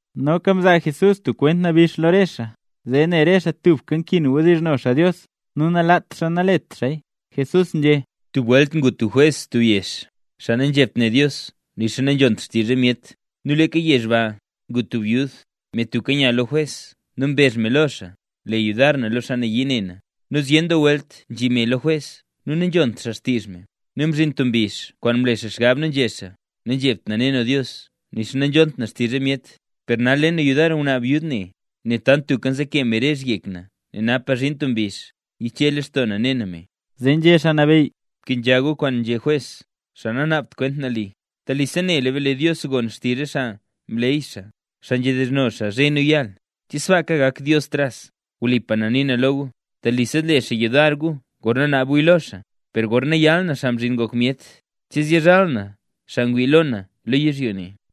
Noka Jesús mzaa tub kwent nabix lo re xaa, zee ne re xaa tubka nkin wdizhno xaa Dios nu nalaat xaa nalet xaaya. —Tub welt ngu tub jwes tub yezh, xaa nanzhebt ne Dios nixa nanzhont xtizh re myet. Nu leeka yezh ba ngu tub byud, me tubka nya lo jwes nu mbezh me lo xaa: “¡Le yudar na lo xaa nayii ne na!” Nu zyen doo welt nzhiya me lo jwes nu nanzhont xaa xtizh me. Nu mzhin tub mbizh kwaan mle xaa xgab nu nzhé xaa: “Nanzhebt na ne na Dios nixa nanzhont na xtizh re myet, per nal le na yudar ngwnaa byud ne, nel tant tubka nzeke me rezh yek na nel napa zhin tub mbizh yiche lextoo na ne na me”. Zee nzhé Xaa Nabeyy: —Bkenzha gu kwaan nzhé jwes, xaa nanaabt kwent nali. ¡Telisa nela be lee Dios gon xtizh re xaa mleey xaa, xaa nzhedizhno xaa zhe nu yaal! ¿Che sbaaka gak Dios tras? Wlipa na nii na lo gu, telisa zle xaa yudar gu gorna naab guya lo xaa; per gorna yal na, Xaa Mzhin Ngok Myet, ¿che zyizhal na xaa ngwii lo na lo yizhyo ne?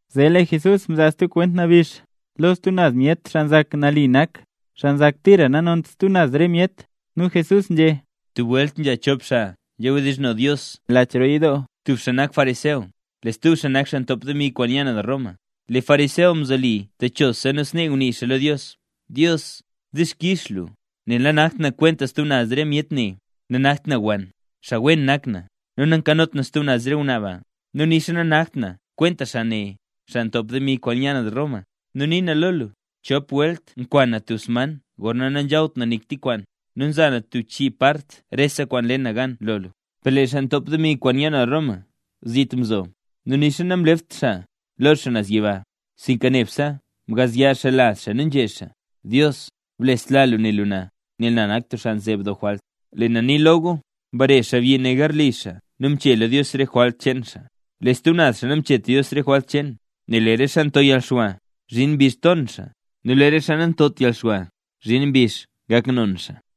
Zee lee Jesús mzaa stub kwent nabix lo stub naz myet xaa nzak nali nak, xaa nzak tira nanont stub naz re myet. Nu Jesús nzhé: —Tub welt nzha chop xaa nzhawdizhno Dios lach roo yidoo. Tub xaa nak fariseo, lee stub xaa nak xaa ntop demi kwaan nya naz Roma. Lee fariseo mzoli techosa nu snee ngunii xaa lo Dios: “Dios, dixkix lu, nel nanakt na kwenta stub naz re myet ne. Nanakt na wann, xaa wen nak na, nu nankanot na stub naz re ngwnaa ba, nu nixa nanakt na kwenta xaa ne, xaa ntop demi kwaan nya naz Roma. Nu nii na lo lu: Chop welt nkwan na tub sman gorna nanzhawt na nik tik kwaan, nu nza na tub chii part rese kwaan nle na gan lo lu.” Per lee xaa ntop demi kwaan nya naz Roma zit mzo; nu nixa namlept xaa lo xaa naz yiba, sinka nebse ngazya xaa laz xaa nu nzhé xaa: “Dios, blesla lu ne lu na, nel na nak tub xaa nzeeb doo jwalt”. Lee na nii lo gu, mbare xaabyi ne garli xaa nu mchela Dios re jwalt cheen xaa. Lee stub xaa namchet Dios re jwalt cheen. Nel lee re xaa nto yalxwa, zhin mbizh ton xaa; nu lee re xaa nantot yalxwa, zhin mbizh gak non xaa.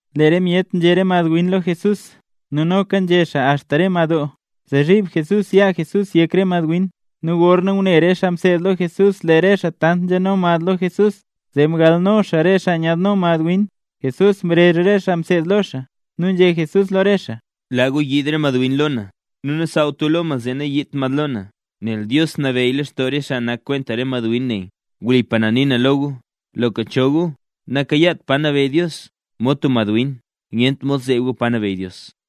Lee re myet nzhe re madwin lo Jesús nu noka nzhe xaa axta re madoo, zee zhiib Jesús yaa Jesús yek re mad win. Nu gorna ngune re xaa mseed lo Jesús lee re xaa tant nzhano mad lo Jesús, zee mgalno xaa re xaa nyaadno mad win. Jesús mrezh re xaa mseed lo xaa nu nzhé Jesús lo re xaa: —Laa gu yiid re madwin lo na, nu nasaawt gu lo mad zee nayiidt mad lo na. Nel Dios nabeyy leen lextoo re xaa nak kwenta re madwin ne. Wlipa na nii na lo gu, loka cho gu nakayaat pa nabeyy Dios, mod tub madwin, nyent mod zeeb gu pa nabeyy Dios.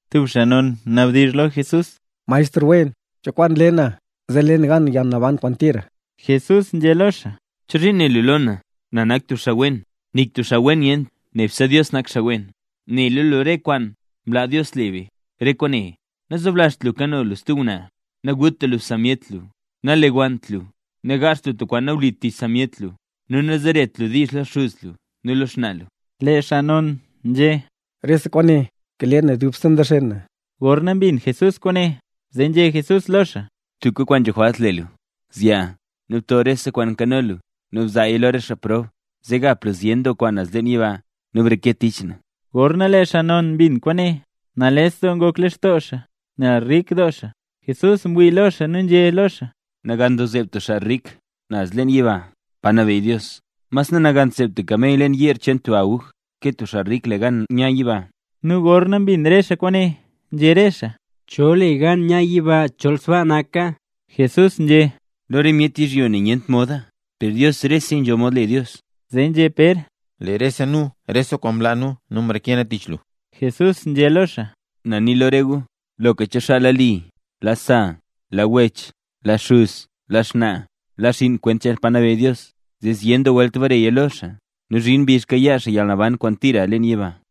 Tub xaa non ngwa mnabdizh lo Jesús: —Maestr wen, ¿cho kwaan le na, zee le na gan yalnaban kwaan tira? Jesús nzhé lo xaa: —¿Chozhiin né lu lo na, na nak tub xaa wen? Nik tub xaa wen nyent, nebse Dios nak xaa wen. Nela lu re kwaan mlaa Dios le be. Re kwaane: nazoblazht lu kano lu stub ngwnaa, naguta lu sa myet lu, nalewannt lu, nagaazht lu tub kwaan nawlit tich sa myet lu, nu nazeret lu diizh lo xuz lu nu lo xnaa lu. Lee xaa non nzhé: —Rese kwaane kale na dubse nzexen na. Gorna mbin Jesús kwaane, zee nzhé Jesús lo xaa: —Tubka kwaan nzho jwalt le lu. Zyaa, nu bto rese kwaan nkano lu nu bzaaya lo re xaa prob, zee gap lu zyen doo kwaan naz leen yiba, nu breke tich na. Gorna lee xaa non mbin kwaane, nales doo ngok lextoo xaa, nel rik doo xaa. Jesús mwii lo xaa nu nzhé xaa: —¡Nagan doo zeeb tub xaa rik naz leen yiba, pa nabeyy Dios! Mas nanagant zeeb tub kamey leen yeer cheen tub aguj, ke tub xaa rik le gan nya yiba. Nu gorna mbin re xaa kwaane, nzhé re xaa: —¿Cho le gan nya yiba chol sbaa naka? Jesús nzhé: —Lo re myet yizhyo ne nyent moda, per Dios reseya nzho mod le Dios. Zee nzhé Pér: —Lee rese nu, rese kwaan mlaa nu, nu mreke nu tich lu. Jesús nzhé lo xaa: —Na nii lo re gu, loka cho xaa laa li, laa sa, laa wech, laa xuz nu xnaa, laa xinn kwent cheen pa nabeyy Dios, zee zyen welt bareya lo xaa nu zhin mbizh kayaa xaa yalnaban kwaan tira leen yiba.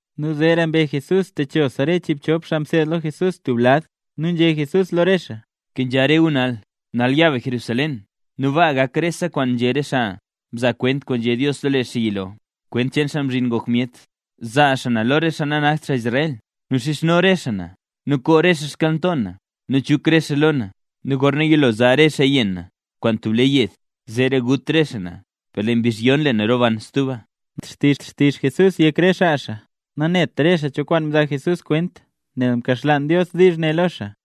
Nu zeera mbe Jesús techosa re chiibchop xaa mseed lo Jesús tub lad nu nzhé Jesús lo re xaa: —Bkenzha gu nal. Nal ya be Jerusalén, nu baa gak rese kwaan nzhé re xaa mzaa kwent kwaan nzhé Dios lo lee xaa yilo, kwent cheen Xaa Mzhin Ngok Myet. Zaa xaa na lo re xaa nanakt xaa Israel, nu xizhno re xaa na; nu koo xaa xkyalnto na, nu chuk re xaa lo na. Nu gorna yilo zaa re xaaya yenn na kwaan tub le yed, zeera gut re xaa na; per lee mbizh yon lee na roban stuba. Namlat xtizh Jesús yek re xaa mseed lo xaa; nanet re xaa cho kwaan mzaa Jesús kwent, nel mkaxlaan Dios diizh ne lo xaa.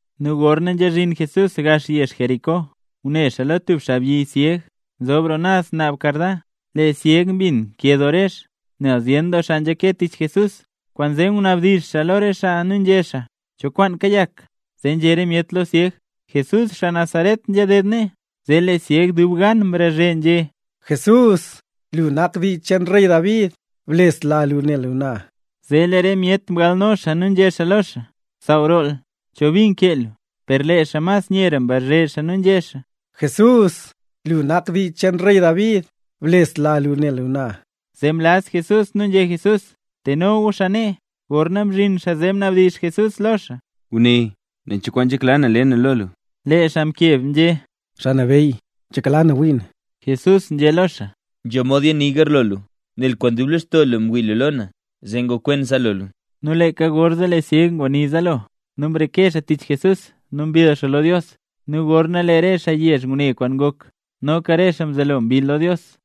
Nu gorna nzhazhin Jesús gax yezh Jericó, ngune xaa lo tub xaabyi syeg nzob roo naz naab karda. Lee syeg mbin nkee doo rezh, nel zyen doo xaa nzhake tich Jesús, kwaanzee ngunabdizh xaa lo re xaa nu nzhé xaa: —¿Cho kwaan kayak? Zee nzhé re myet lo syeg: —Jesús xaa Nazaret nzhaded nee. Zee lee syeg dub gan mrazhe nzhé: —¡Jesús, lu nak xaa dii cheen rey David, blesla lu ne lu na! Zee lee re myet mgalno xaa nu nzhé xaa lo xaa: —¡Saaw roo lu! ¿Cho bi nkee lu? Per lee xaa mas nyera mrazhe xaa nu nzhé xaa: —¡Jesús, lu nak xaa dii cheen rey David, blesla lu ne lu na! Zee mlaz Jesús nu nzhé Jesús: —Teno gu xaa nee. Gorna mzhin xaa zee mnabdizh Jesús lo xaa: —Guné, nen cho kwaan nzhekla lu le na lo lu. Lee xaa mkeb nzhé: —Xaa Nabeyy, nzhekla na wii na. Jesús nzhé lo xaa: —Nzho mod yani garlo lu, nel kwaan dub lextoo lu ngwii lu lo na, zee gakwen zaalo lu. Nu leeka gorzee lee syeg nguni zaalo nu mreke xaa tich Jesús nu mbill xaa lo Dios. Nu gorna lee re xaa yezh ngune kwaan ngok, noka re xaa mzelo mbill lo Dios.